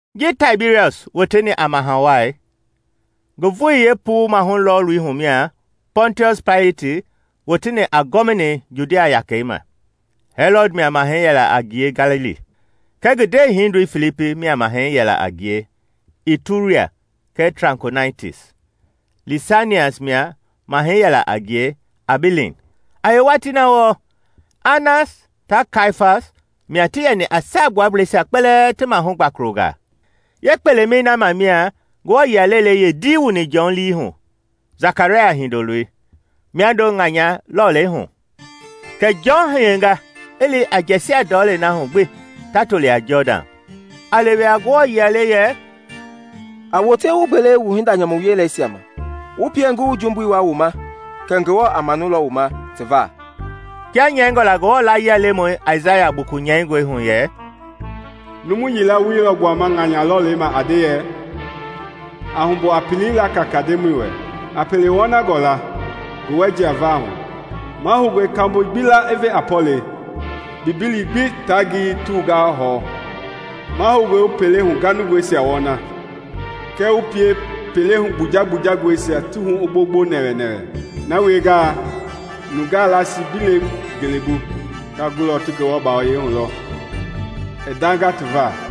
Ji Taibiriɔs woteni a Maha Wai, ngi vooi yee puu-mahu-lɔɔlui hu mia Pɔntiɔsi Paileti woteni a ti gɔvinei Judea yakɛi ma, Hɛlɔd mia mahɛi yɛla a ngie Galili, kɛɛ ngi ndee-hindoi Filipi mia mahɛi yɛla a ngie Ituria kɛɛ Trakonitis, Lisanias mia mahɛi yɛla a ngie Abileen; a yee watii na wɔɔ, Anas ta Kaiafas mia ti yɛni a saagbuableisia kpɛlɛɛ ti mahu gbakolongaa. Yee kpelemɛi na ma mia Ngewɔ-yia lelei yee dii wuni Jɔn lii hu, Sakaraya hindoloi, miando ŋanya lɔlei hu. Kɛ Jɔn hiyenga i li i jɛsia ndɔlei na hu gbi ta toli a Jɔdan, a lewe a Ngewɔ-layie le yɛ, “A wote wu gbele wu hinda-nyamu wieleisia ma, wu pie ngi wu jumbui wua wu ma kɛ Ngewɔ a manulɔ wu ma ti va.” Kia nyɛingɔ la Ngewɔ-layia-lemɔi Aisaya buku nyɛingɔi hu yɛ: “Numu yila woi lɔ gbuama ŋanya lɔlei ma a nde yɛ: ‘A humbu a pelei la kaka Ndemɔi wɛ; A pele wɔnangɔ la ngi wɛ jiava hu! Mahoungɔe kambo gbi la i ve a pɔlɛi, mbimbili gbi taa ngiyei ti wunga i hɛwu. Mahoungɔe wu pele huganungɔisia wɔna, kɛɛ wu pie pele-hu kpuja kpuja-ngɔisia ti hu i gbongbo nɛwɛnɛwɛ. “ ‘Na wiengaa, nungaa lasi gbi lekee ngelebu, ta gulɔ ti Ngewɔ bawoyɛi hu lɔ i ndanga ti va!’”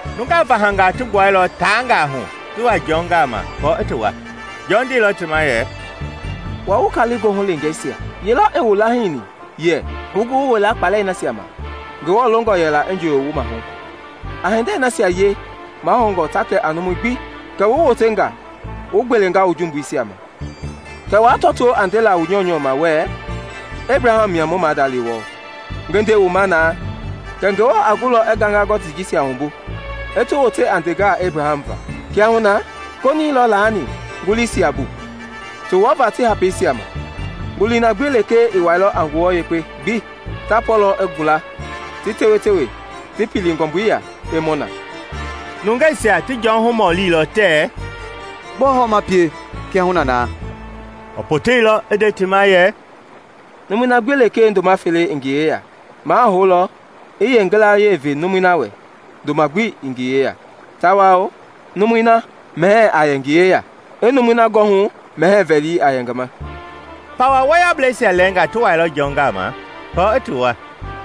Nungaa vahangaa ti gbuailɔ tangaahu ti wa Jɔn gama kɔɔ i ti wua. Jɔn ndeilɔ ti ma yɛ: “Wua, wu kali goohu leengeisia! Yelɔ i wu lahiini yɛ wu gu wu wila kpalɛi na ma Ngewɔ longɔ yɛla i njooyo wu mahu? A hindei nasia wie ti mahoungɔ ta kɛ a numu gbi kɛ wu wotenga wu gbelenga wu jumbuisia ma. Kɛɛ waa tɔtoo a ndela wu nyɔunyɔ ma wuɛ Ebraham mia wu maada le wɔɔ. Ngi nde wu ma na, kɛ Ngewɔ a gulɔ i gaŋaa gɔtii jisia wumbu, i ti wote a ndengaa Ebraham va! Kiahuna, konii lɔ laani nguliisia bu ti wɔɔva ti hapeisia ma; ngulii na gbi lekee ii wuailɔ a ngua yekpe gbi, ta pɔɔlɔ i gula, ti tewe-tewe, ti pili ngɔmbui ya i mɔ na.” Nungeisia ti Jɔn humɔlilɔ tɛ, “Gbɔɔ hɔ ma pie, kiahuna na?” I poteilɔ i nde ti ma yɛ, “Numui na gbi lekee ndoma fele i ngi yeya, ma a houlɔ i yee ngilayee ve numui na wɛ ndoma gbi ii ngi yeya; tawao numui na mɛhɛɛ a yɛ ngi yeya, i numui na gɔhu mɛhɛɛ vɛli a yɛ ngi ma.” Pawa wɔyɔblɛisia lɛɛnga ti wailɔ Jɔn gama kɔɔ i ti wua,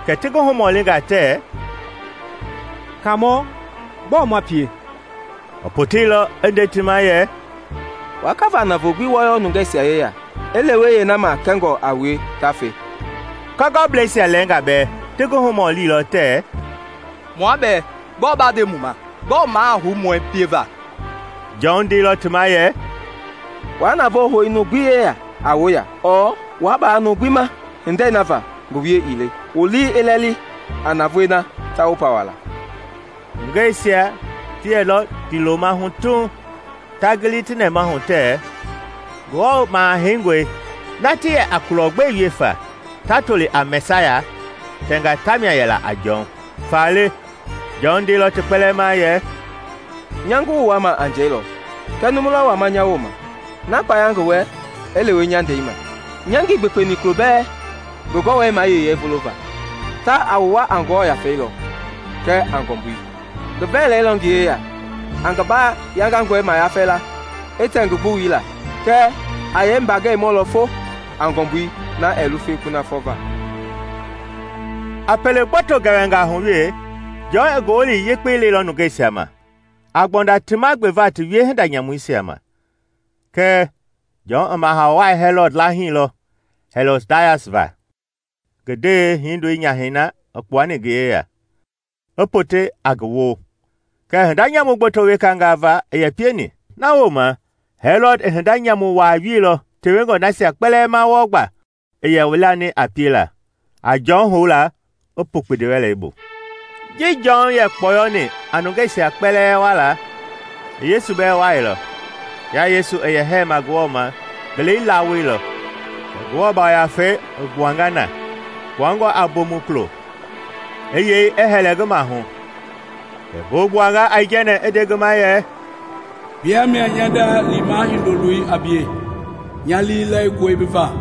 kɛ ti ngi humɔlinga tɛ, “Kaamɔ, gbɔɔ ma pie?” I poteilɔ i nde ti ma yɛ, “Wa kaava navoo gbi wɔyɔ nungɛsia yeya, i lewe yee na ma kɛngɔ a wue ta fe.” Kɔgɔbleisia lɛɛnga bɛɛ ti ngi humɔlilɔ tɛ, “Mua bɛɛ, gbɔɔ ba nde mu ma? Gbɔɔ ma a hou mu wɛ pieva?” Jɔn ndeilɔ ti ma yɛ, “Waa navoo hou numu gbi yeya a woya ɔɔ waa baa numu gbi ma hindei na va ngi wie ii le. Wu lii i lɛli a navoei na ta wu pawala.” Nungeisia ti yɛlɔ ndiiloma hu tuuŋ ta gilila ti nɛmahu tɛ Ngewɔ Maha-heingɔi na ti yɛ a kulɔ gbe wie fa, ta toli a Mɛsaya, tɛnga tamia yɛla a Jɔn. Faale, Jɔn ndeilɔ ti kpɛlɛɛ ma yɛ, “Nya ngi wu wua ma a njɛi lɔ, kɛɛ numu lɔ wama nya wooma, na kpaya ngi wɛ i lewe nya ndɛi ma. Nya ngii gbekpeni kulobɛɛ ngi gɔwɛi mayeyei vulova. Ta, a wu wua a Ngewɔ Yafei lɔ kɛɛ a ngɔmbui. Ngi vɛlɛi lɔ ngi yeya a ngi ba-yangangɔi mayafɛ la, i tɛ ngi gbuwui la; kɛɛ, a yee mbagɛi mɔlɔ fo a ngɔmbui na ɛɛ lufe kunafɔ va.” A pele gboto gɛwɛnga hu wee, Jɔn i Ngowili Yekpei leilɔ nungeisia ma, a gbɔnda ti ma gbeva ti wie-hinda-nyamuisia ma. Kɛɛ, Jɔn i Maha Wai Hɛlɔd lahiilɔ, Hɛlɔdias va, ngi ndee hindoi nyahɛi na i kpuani ngi yeya, i pote a ngi wo, kɛɛ hinda-nyamu gboto wekanga va i yɛ pieni. Na wooma, Hɛlɔd i hinda-nyamu wa wielɔ tewengɔ nasia kpɛlɛɛ ma wɔɔ gba i yɛ welani a piela, a Jɔn houla i pu kpindiwɛlei bu. Ji Jɔn yɛ kpɔyɔni a nungeisia kpɛlɛɛ wuala, i Yesu bɛɛ wuailɔ. Kia Yesu i yɛ hɛɛma Ngewɔ ma, ngelei lawoilɔ, kɛ Ngewɔ Yafei i gbuanga na, kpuangɔ a bomukulo, i yɛi i hɛlɛ ngi mahu. Kɛ ngo gbuanga aijɛnɛ i nde ngi ma yɛ, “Bia mia nya nda liima Hindo-loi a bie. Nya lii lɛlingɔe bi va.”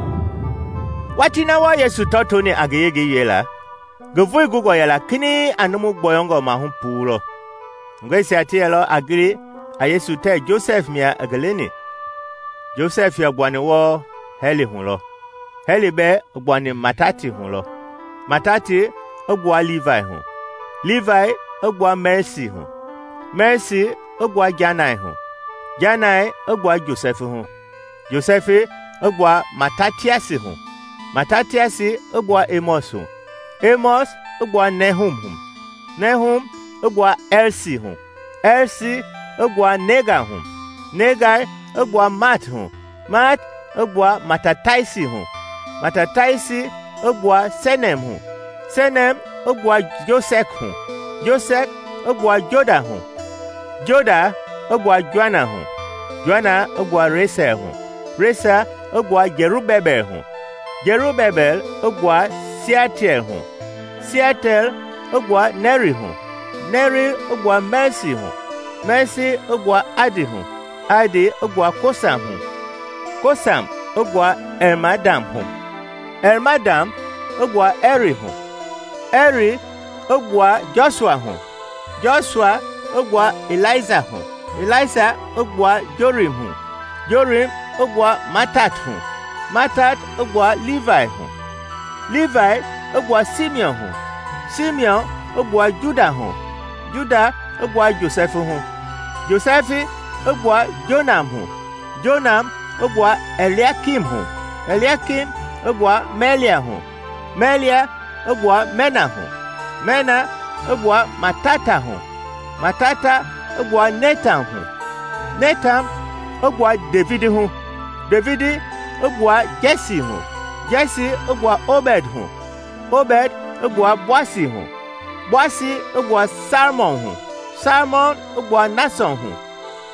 Watii na wɔɔ Yesu tɔtooni a ngi yengei wiela, ngi vooi gungɔ yɛla kinɛiŋ a numu-gbɔyɔngɔ-mahu-puu lɔ. Nungeisia ti yɛlɔ a gili a Yesu tɛ Josɛf mia i ngi leni. Josɛf yɛ gbuani wɔɔ Hɛli hu lɔ. Hɛli bɛɛ i gbuani Matati hu lɔ, Matati i gbua Liivai hu, Liivai i gbua Mɛlsi hu, Mɛlsi i gbua Jannai hu, Jannai i gbua Josɛfi hu, Josɛfi i gbua Matatiasi hu, Matatiasi i gbua Emɔs hu, Emɔs i gbua Nehum hu; Nehum i gbua Ɛlsi hu, Ɛlsi i gbua Nagai hu; Nagai i gbua Maat hu, Maat i gbua Matataiasi hu, Matataiasi i gbua Semein hu; Semein i gbua Josɛk hu, Josɛk i gbua Joda hu, Joda i gbua Joana hu, Joana i gbua Resa hu, Resa i gbua Jɛrubebɛl hu, Jɛrubebɛl i gbua Sialtiɛl hu, Sialtiɛl i gbua Nɛri hu, Nɛri i gbua Mɛlsi hu, Mɛlsi i gbua Adi hu, Adi i gbua Kosam hu, Kosam i gbua Ɛlmadam hu, Ɛlmadam i gbua Ɛri hu, Ɛr i gbua Jɔsua hu, Jɔsua i gbua Ɛlisa hu, Ɛlisa i gbua Jorim hu, Jorim i gbua Mattat hu, Mattat i gbua Liivai hu, Liivai i gbua Simiɔn hu, Simiɔn i gbua Juda hu, Juda i gbua Josɛfi hu, Josɛfi i gbua Jonam hu, Jonam i gbua Ɛliakim hu, Ɛliakim i gbua Mɛlea hu, Mɛlea i gbua Mɛna hu, Mɛna i gbua Mattata hu, Mattata i gbua Netan hu, Netan i gbua Devidi hu, Devidi i gbua Jɛsi hu, Jɛsi i gbua Obɛd hu, Obɛd i gbua Boasi hu, Boasi i gbua Salmɔn hu, Salmɔn i gbua Nasɔn hu,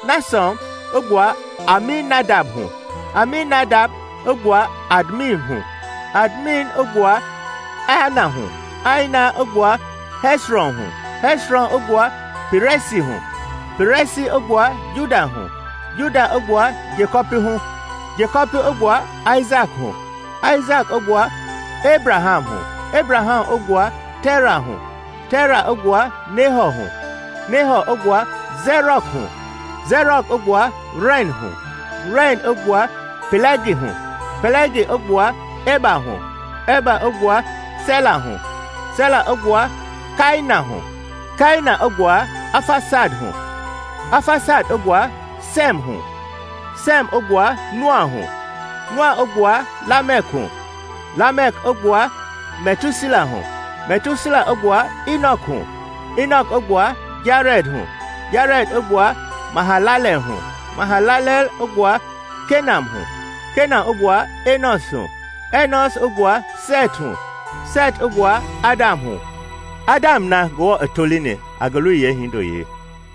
Nasɔn i gbua Aminadab hu, Aminadab i gbua Admin hu, Admin i gbua Aani hu, Aani i gbua Hɛsrɔn hu, Hɛsrɔn i gbua Pɛrɛsi hu, Pɛrɛsi i gbua Juda hu, Juda i gbua Jekɔpi hu, Jekɔpi i gbua Aisaki hu, Aisaki i gbua Ebraham hu, Ebraham i gbua Tera hu, Tera i gbua Nehɔ hu, Nehɔ i gbua Sɛrɔg hu, Sɛrɔg i gbua Ren hu, Ren i gbua Pɛlɛgi hu, Pɛlɛgi i gbua Ɛba hu, Ɛba i gbua Sɛla hu, Sɛla i gbua Kainan hu, Kainan i gbua Afasad hu, Afasad i gbua Sɛɛm hu, Sɛɛm i gbua Noa hu, Noa i gbua Lamɛk hu, Lamɛk i gbua Mɛtusela hu, Mɛtusela i gbua Inɔk hu, Inɔk i gbua Jarɛd hu, Jarɛd i gbua Mahalaleel hu, Mahalaleel i gbua Kenan hu, Kenan i gbua Ɛnɔs hu, Ɛnɔs i gbua Sɛt hu, Sɛt i gbua Adam hu, Adam na Ngewɔ i tolini a ngi loi yee hindo-yeei.